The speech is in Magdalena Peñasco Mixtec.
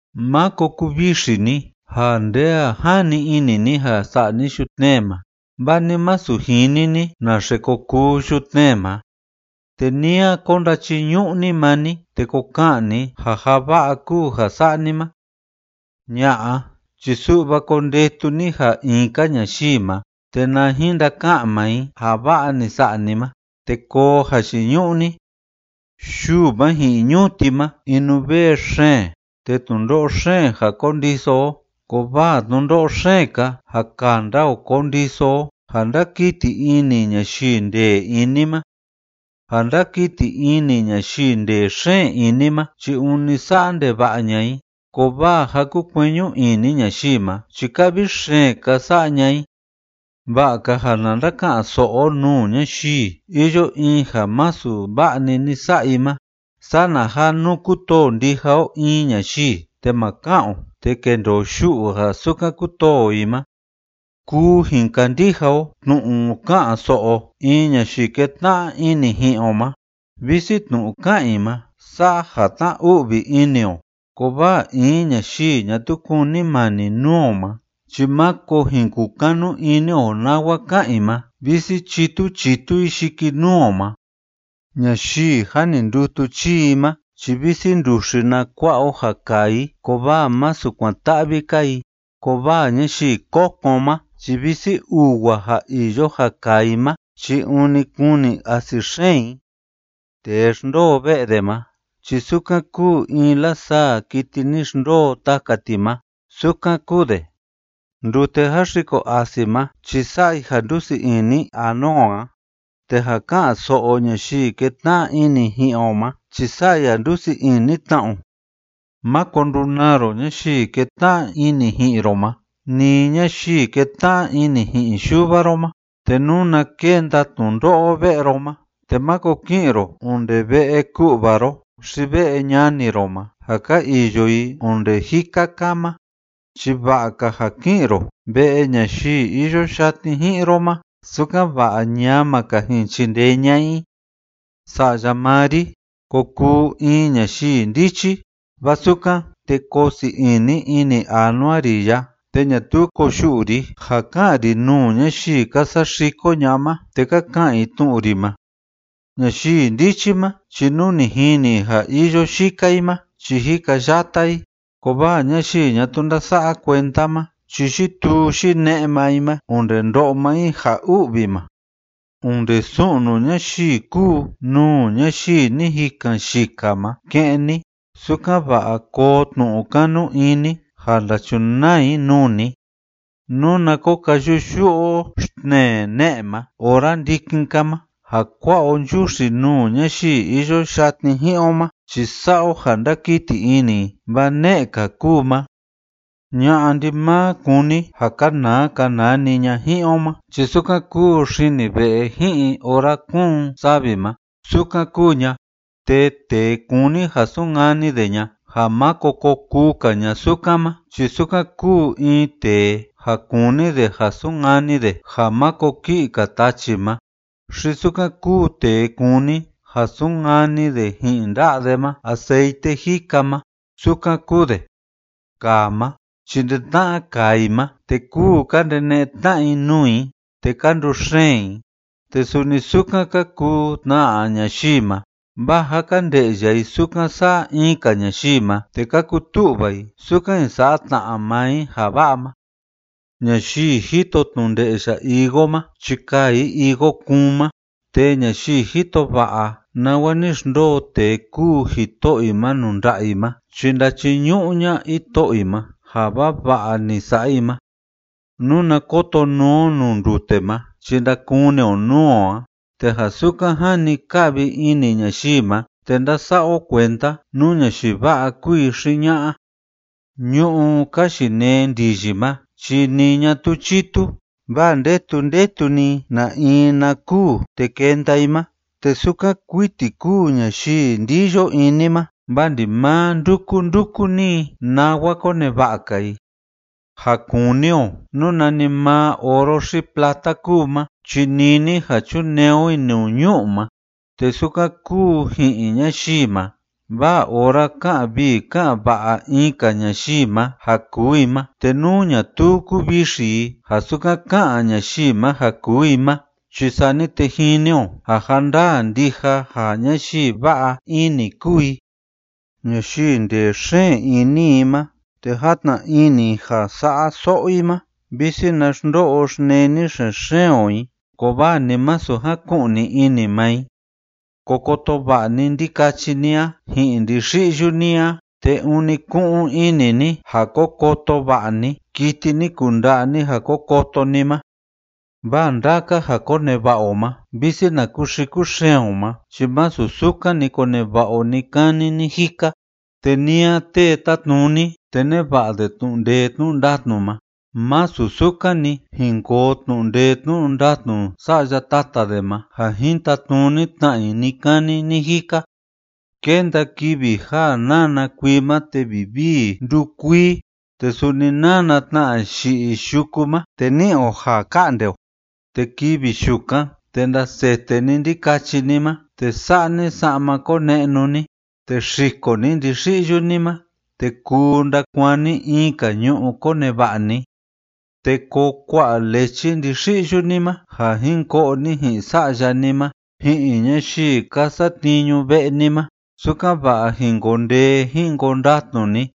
Máko kuvixi ni ja nde a jani ini ni ja sa'a ni yutnee ma, vaa ni masu jini ni naxe ko kuu yutnee ma, te ni a ko ndachiñu'u ni maa ni te ko ka'an ni ja ja va'a kúu ja sa'a ni ma. Ña'a, chi su'va kondetu ni ja in‑ka ñayii ma, te na jin ndaka'an maa i ja va'a ni sa'a ni ma te koo jayiñu'u ni. Yuu ma ji'in ñuti ma inuvee xeen te tnundo'o xeen ja kondiso o, kovaa tnundo'o xeen‑ka ja kanda o kondiso o ja ndákiti ini ñayii ndee ini ma. Ja ndákiti ini ñayii ndee xeen ini ma chi ûni sa'a ndeva'a ña'a i, kovaa ja kúkueñu ini ñayii ma chi ka'vi xeen‑ka sa'a ña'a i. Va'a‑ka ja na ndaka'an‑so'o o nuu ñayii iyo in ja masu va'a‑ni ni sa'a i ma, sana ja nú kutoo ndija o in ñayii, te ma ka'an o te kendoo yu'u ja sukan kutoo o i ma. Kuu jin kandija o tnu'u ka'an‑so'o in ñayii ketna'a ini ji'in o ma, visi tnu'u ka'an i ma sa'a ja tná‑u'vi ini o. Kovaa in ñayii ñatuu kunimani nuu o ma chi máko jin kukanu ini o nawa ka'an i ma, visi chítu chítu i yikinuu o ma. Ñayii jâ ni ndutu chii i ma chi visi nduxi na kua'a o ja kaa i, kovaa masu kuan‑ta'vi‑ka i, kovaa ñayii kokon ma chi visi uwa ja iyo ja kaa i ma chi ûni kuni asi xeen i. Tee xndoo ve'e de ma chi sukan kúu in lasaa kiti ni xndoo taka ti ma, sukan kúu de. Ndute jáxiko asi ma chi sa'a i ja ndúsii ini anua o a, te ja ká'an‑so'o ñayii kétna'a ini ji'in o ma chi sa'a i ja ndúsii ini tna o. Máko ndunaa ro ñayii kétna'a ini ji'in ro ma ni ñayii kétna'a ini ji'in yuva ro ma, te nuna kenda tnundo'o ve'e ro ma te máko ki'in ro onde ve'e ku'va ro xi ve'e ñani ro ma ja ka iyo i onde jika‑ka ma, chi va'a‑ka ja ki'in ro ve'e ñayii iyo yatni ji'in ro ma, sukan‑va'a ñama‑ka jin chindee ña'a i. Sa'ya maa ri, ko kuu in ñayii ndichi, vaa sukan, te koo sii ini ini anua ri a, te ñatuu koyu'u ri ja ka'an ri nuu ñayii ka saxiko ña'a ma te ka ka'an i tnu'u ri ma. Ñayii ndichi ma chi nú ni jini i ja iyo yika i ma chi jikayata i, kovaa ñayii ñatuu ndása'a kuenda ma chi yituu yine'e maa i ma onde ndo'o maa i ja u'vi ma. Onde su'nu ñayii kúu nuu ñayii ni jikan yika ma ke'en ni, sukan‑va'a koo tnu'u kanu ini ni ja ndachunaa i nuu ni. Nuna ko kayu'u‑yu'u o xtnee ne'e ma ora ndikin‑ka ma ja kua'a o nchuxi nuu ñayii iyo yatni ji'in o ma chi sa'a o ja ndakiti ini i, vaa ne'e‑ka kúu ma. Ña'a ndimaa kúni ja kanaa kanaa‑ni ña ji'in o ma chi sukan kúu xini ve'e ji'in ora kúun savi ma, sukan kúu ña, te tee kúni ja sunkani de ña ja máko ko kuu‑ka ña sukan ma chi sukan kúu in tee ja kúni de ja sunkani de ja máko ki'i‑ka tachi ma, xi sukan kúu tee kúni ja sunkani de ji'in nda'a de ma aceite jika ma, sukan kúu de. Kaa ma chi ndi-tna'a kaa i ma, te kúu ka ndene'e tna'a i nuu i te ka nduxeen i, te suni sukan ka kuu tna ñayii ma, vaa ja ka nde'ya i sukan sa'a in‑ka ñayii ma, te ka kutu'va i sukan jin sa'a tna maa i ja va'a ma. Ñayii jito tnu nde'ya higo ma chi kaa i higo kuun ma, te ñayii jito va'a nawa ni xndoo tee kúu jito'o i ma nuu nda'a i ma chi ndachiñu'u ña'a jito'o i ma ja vava'a ni sa'a i ma. Nuna koto nuu o nuu ndute ma chi ndakuni o nuu o a, te ja sukan jani ka'vi ini ñayii ma te ndása'a o kuenda nú ñayii va'a kúu i xi ña'a. Ñu'ú ka yinee ndiyi ma chi ni ñatuu chitu vaa ndetu ndetu‑ni i na in na kûu te kenda i ma, te sukan kuiti kúu ñayii ndiyo ini ma, vaa ndimaa ndúku ndúku‑ni i nawa koneva'a‑ka i. Ja kuni o nú nanimaa oro xi plata kúu ma chi nini ja chunee o i nuu ñu'u ma, te sukan kúu ji'in ñayii ma, vaa ora ká'an vii ká'an va'a in‑ka ñayii ma ja kuu i ma, te nú ñatuu kuvixi i ja sukan ká'an ñayii ma ja kuu i ma chi sani te jini o ja ja ndaa ndija ja ñayii va'a ini kúu i. Ñayii ndee xeen ini i ma te játna ini i ja sa'a so'o i ma, visi na xndo'o xneni xen‑xeen o i, kovaa ni masu jaku'ni ini maa i. Ko koto va'a ni ndikachi ni a ji'in ndixi'yu ni a, te ûni ku'un ini ni ja ko koto va'a ni kiti ni kunda'a ni ja ko koto ni ma, vaa ndaka ja koneva'a o ma visi na kuxiku xeen o ma chi masu sukan‑ni koneva'a o ni‑kani ni‑jika, te ni a tee tátnuni te neva'a de tnu'u ndee tnu'u ndatnu ma, másu sukan‑ni jin koo tnu'u ndee tnu'u ndatnu sa'ya tata de ma ja jin tatnuni tna i ni‑kani ni‑jika. Kénda kivi ja nána kuii ma te vivii ndúkuii te suni nána tna yi'i yuku ma, te ní'i o ja ka'nde o. Te kivi yukan, te ndasete ni ndikachi ni ma te sa'a ni sa'ma kone'nu ni, te xiko ni ndixi'yu ni ma te kuu ndakuaan ni in‑ka ñu'u koneva'a ni. Te koo kua'a lechi ndixi'yu ni ma ja jin ko'o ni ji'in sa'ya ni ma ji'in ñayii ka satniñu ve'e ni ma, sukan‑va'a jin koo ndee jin koo ndatnu ni.